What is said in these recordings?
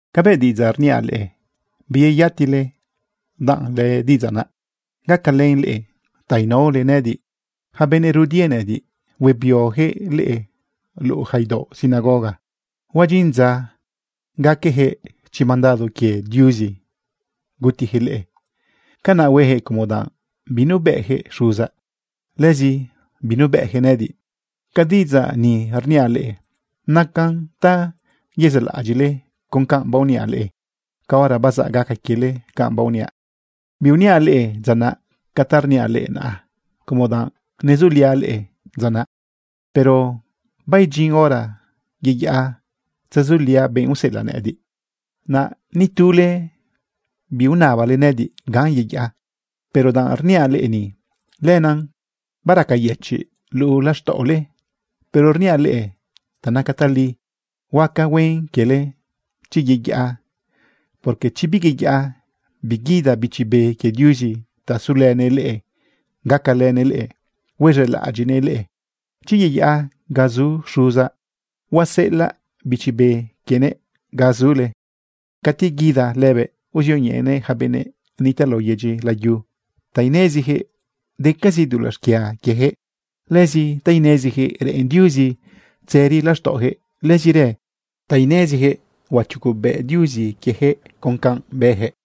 ’Cabëꞌ diꞌidzaꞌ rniaꞌ leꞌe, biyeyatile danꞌ lëdiꞌidzaꞌ naꞌ gacalën leꞌe ta inaole nëꞌëdiꞌ. Yaca benëꞌ rudie nëꞌëdiꞌ huebioyaquëꞌ leꞌe luꞌu yaca idaoꞌ sinagoga. Huadyin dza gaqueyaquëꞌ chi mandado quie Diuzi gutiyaquëꞌ leꞌe. Canaꞌ hueyaquëꞌ como danꞌ binubëꞌyaquëꞌ Xuzaꞌ, lëzi binubëꞌyaquëꞌ nëꞌëdiꞌ. Ca diꞌidzaꞌ ni rniaꞌ leꞌe, nacan ta yezaꞌlaꞌadyiꞌle con canꞌ baoniaꞌ leꞌe caora bazaꞌ gaca quiele canꞌ baoniaꞌ. ’Biuniaꞌ leꞌe dzaꞌ naꞌ ca ta rniaꞌ leꞌe naꞌa, como danꞌ nezuliaꞌ leꞌe dza naꞌ. Pero baidyin hora yeyaꞌa tzezuliaꞌ benꞌ useꞌelaꞌ nëꞌëdiꞌ. Naꞌ ni tule biunabale nëꞌëdiꞌ ganꞌ yeyaꞌa. Pero danꞌ rniaꞌ leꞌe ni, lenaꞌ baraqueyëchiꞌ luꞌu laxtaꞌole. Pero rniaꞌ leꞌe ta naca tali. Huaca huen quiele chi yeyaꞌa, porque chi biyeyaꞌa, biguida Bichi Be quie Diuzi ta sulënëꞌ leꞌe gacalënëꞌ leꞌe huez̃elaꞌadyiꞌnëꞌ leꞌe. Chi yeyaꞌa ga zu Xuzaꞌ, huaseꞌelaꞌ Bichi Be quienëꞌ ga zule. Cati guida lëbëꞌ uzioñeꞌenëꞌ yaca benëꞌ nitaꞌ lao yedyi layu ta ineziyaquëꞌ decazi dulaꞌ xquia quieyaquëꞌ, lëzi ta ineziyaquëꞌ reꞌen Diuzi tzëri laxtaꞌoyaquëꞌ, lëzirë ta ineziyaquëꞌ huachugobëꞌ Diuzi quieyaquëꞌ con canꞌ bëyaquëꞌ.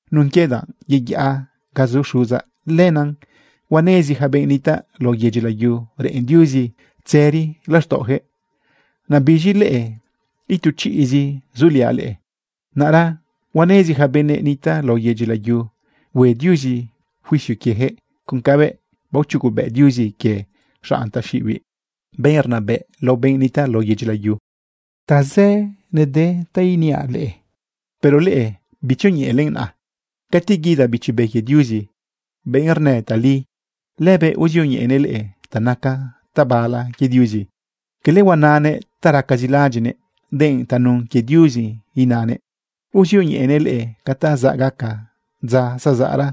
Nun quie danꞌ yeyaꞌa ga zu Xuzaꞌ, lenaꞌ huanezi yaca benꞌ nitaꞌ lao yedyi layu reꞌen Diuzi tzëri laxtaꞌoyaquëꞌ. Naꞌ biz̃i leꞌe, itu chiꞌzi zuliaꞌ leꞌe. Naꞌra huanezi yaca benëꞌ nitaꞌ lao yedyi layu hue Diuzi juicio quieyaquëꞌ con cabëꞌ baochugobëꞌ Diuzi quie xanꞌ taxiꞌibiꞌ, benꞌ rnabëꞌ lao benꞌ nitaꞌ lao yedyi layu. ’Tazë nede ta iniaꞌ leꞌe, pero leꞌe bitzioñeꞌelen naꞌa. Cati guida Bichi Be quie Diuzi, benꞌ rnë tali, lëbëꞌ uzioñeꞌenëꞌ leꞌe ta naca tabala quie Diuzi. Quele huananëꞌ ta racazi laꞌadyiꞌnëꞌ, denꞌ tanun quie Diuzi inanë. Uzioñeꞌenëꞌ leꞌe ca ta zaꞌ gaca dza zazaꞌra.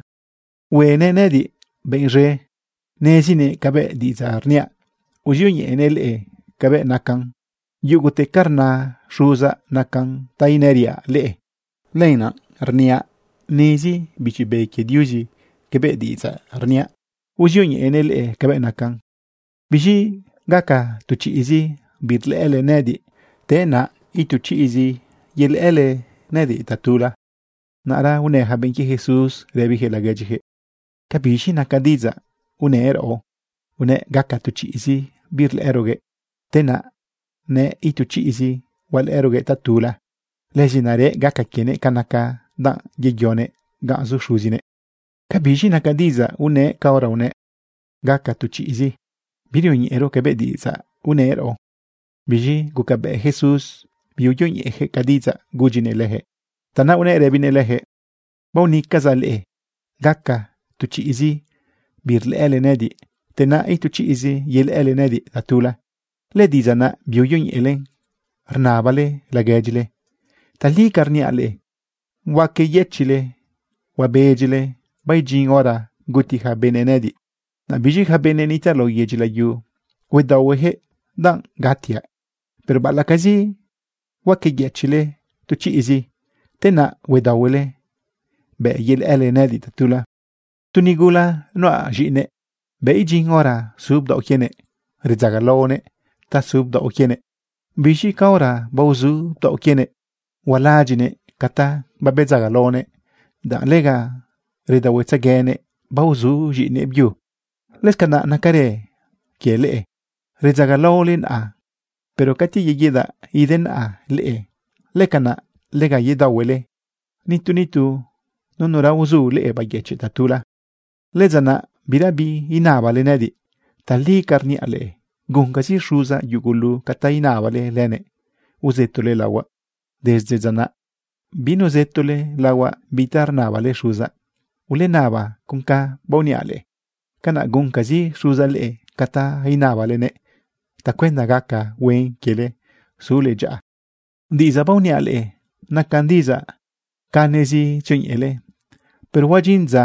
Huenëꞌ nëꞌëdiꞌ benꞌ zëꞌ. Nezinëꞌ cabëꞌ diꞌidzaꞌ rniaꞌ, uzioñeꞌenëꞌ leꞌe cabëꞌ nacan. Yugute ca rna Xuzaꞌ nacan ta inëriaꞌ leꞌe. Lenaꞌ rniaꞌ nezi Bichi Be quie Diuzi cabëꞌ diꞌidzaꞌ rniaꞌ, uzioñeꞌenëꞌ leꞌe cabëꞌ nacan. ’Biz̃i gaca tu chiꞌzi birlëꞌële nëꞌëdiꞌ, te naꞌ itu chiꞌzi yelëꞌële nëꞌëdiꞌ tatula. Naꞌra unë yaca benꞌ quie Jesús rëbiyaquëꞌ laguedyiyaquëꞌ: ―¿Ca biz̃i naca diꞌidzaꞌ unëꞌ raꞌo? Unëꞌ gaca tu chiꞌzi birlëꞌëroguëꞌ, te naꞌ nëꞌ itu chiꞌzi hualëꞌëroguëꞌ tatula. Lëzi narëꞌ gaca quienëꞌ canaꞌ danꞌ yeyonëꞌ ganꞌ zu Xuzinëꞌ. ¿Ca biz̃i naca diꞌidzaꞌ unëꞌ caora unëꞌ: “Gaca tu chiꞌzi”? Birioñeꞌero cabëꞌ diꞌidzaꞌ unëꞌ raꞌo. Biz̃i gucabëꞌ Jesús biuyoñeꞌeyaquëꞌ ca diꞌidzaꞌ gudyinëꞌ leyaquëꞌ. Tanaꞌ unëꞌ rëbinëꞌ leyaquëꞌ: ―Baonëcazaꞌ leꞌe gaca tu chiꞌzi birlëꞌële nëꞌëdiꞌ, te naꞌ itu chiꞌzi yelëꞌële nëꞌëdiꞌ tatula. ¿Lëdiꞌidzaꞌ naꞌ biuyoñeꞌele rnabale laguedyile? Tali ca rniaꞌ leꞌe, huaqueyëchiꞌle huabedyile baidyin hora guti yaca benëꞌ nëꞌëdiꞌ. Naꞌ biz̃i yaca benëꞌ nitaꞌ lao yedyi layu, huedaohueyaquëꞌ danꞌ gatiaꞌ. Pero baꞌalaꞌcazi huaqueyëchiꞌle tu chiꞌzi, te naꞌ huedaohuele bëꞌ yelëꞌële nëꞌëdiꞌ tatula. Tu nigula nuꞌa z̃iꞌine, bëꞌ idyin hora su bdaoꞌ quienëꞌ, redzagalaonëꞌ ta su bdaoꞌ quienëꞌ. Biz̃i caora baozu bdaoꞌ quienëꞌ, hualaꞌadyiꞌnëꞌ ca ta babedzagalaonëꞌ, danꞌ lega redaohuetzeguenëꞌ baozu z̃iꞌinëꞌ byu. Lëscanaꞌ nacarë quie leꞌe. Redzagalaole naꞌa, pero cati yeguidaꞌ denaꞌa leꞌe, lëcanaꞌ lega yedaohuele. Nitu nitu nunura uzu leꞌe bayëchiꞌ tatula. ’Lëdza naꞌ birabi inabale nëꞌëdiꞌ. Tali ca rniaꞌ leꞌe, guncazi Xuzaꞌ yugulu ca ta inabale lënëꞌ uzëtole laohuaꞌ. Desde dza naꞌ binuzëtole laohuaꞌ bi ta rnabale Xuzaꞌ. Ulenaba con canꞌ baoniaꞌ leꞌe. Canaꞌ guncazi Xuzaꞌ leꞌe ca ta inabalenëꞌ tacuenda gaca huen quiele sule dyaꞌa. ’Diꞌidzaꞌ baoniaꞌ leꞌe nacan diꞌidzaꞌ canezi tzioñeꞌelen. Pero huadyin dza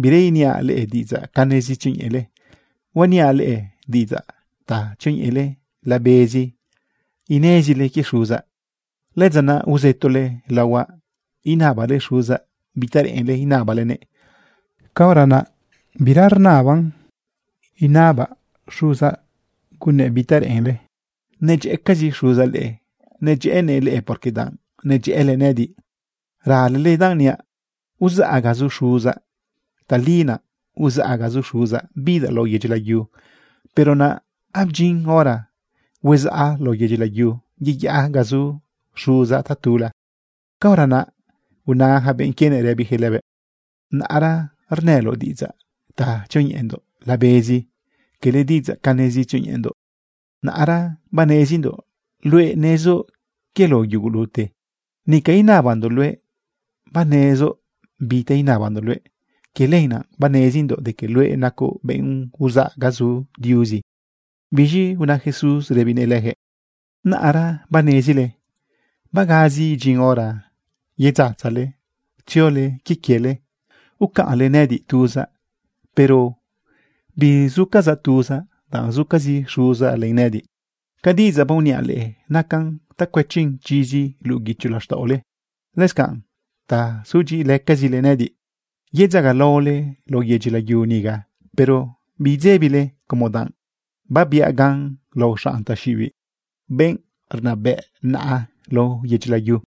bira iniaꞌ leꞌe diꞌidzaꞌ canezi tzioñeꞌelen, huaniaꞌ leꞌe diꞌidzaꞌ ta tzioñeꞌele labezi inezile quie Xuzaꞌ. Lëdza naꞌ uzëtole laohuaꞌ inabale Xuzaꞌ bi ta reꞌenle inabalenëꞌ. Caora naꞌ bira inaban inabaꞌ Xuzaꞌ gunnëꞌ bi ta reꞌenle. Nedyëꞌëcazi Xuzaꞌ leꞌe. Nedyëꞌënëꞌ leꞌe porque danꞌ nedyëꞌële nëꞌëdiꞌ, ralele danꞌ niaꞌ uzaꞌ ga zu Xuzaꞌ. Tali naꞌ uzaꞌ ga zu Xuzaꞌ bidaꞌ lao yedyi layu. Pero naꞌ abdyin hora huezaꞌ lao yedyi layu, yeyaꞌa ga zu Xuzaꞌ tatula. Caora naꞌ una yaca benꞌ quienëꞌ rëbiyaquëꞌ lëbëꞌ: ―Naꞌra rnëloꞌ diꞌidzaꞌ ta tzioñeꞌendoꞌ labezi, quele diꞌidzaꞌ canezi tzioñeꞌendoꞌ. Naꞌra banezindoꞌ luëꞌ nezoꞌ quie lao yugulute. Nica inabandoꞌ luëꞌ banezoꞌ bi ta inabandoꞌ luëꞌ. Quie lenaꞌ banezindoꞌ de que luëꞌ nacoꞌ benꞌ uzaꞌ ga zu Diuzi. Biz̃i una Jesús rëbinëꞌ leyaquëꞌ: ―¿Naꞌra banezile? Bagazi idyin hora yedzatzale tziole quie quiele ucaꞌnle nëꞌëdiꞌ tuzaꞌ. Pero bizucazaꞌ tuzaꞌ danꞌ zucazi Xuzaꞌ len nëꞌëdiꞌ. Ca diꞌidzaꞌ baoniaꞌ leꞌe nacan ta cuëchin chizi luꞌu guicho laxtaꞌole, lëscanꞌ ta sudyiꞌilëcazile nëꞌëdiꞌ. Yedzagalaole lao yedyi layu niga, pero bidzebile como danꞌ babiaꞌ gan lao xanꞌ taxiꞌibiꞌ, benꞌ rnabëꞌna lao yedyi layu.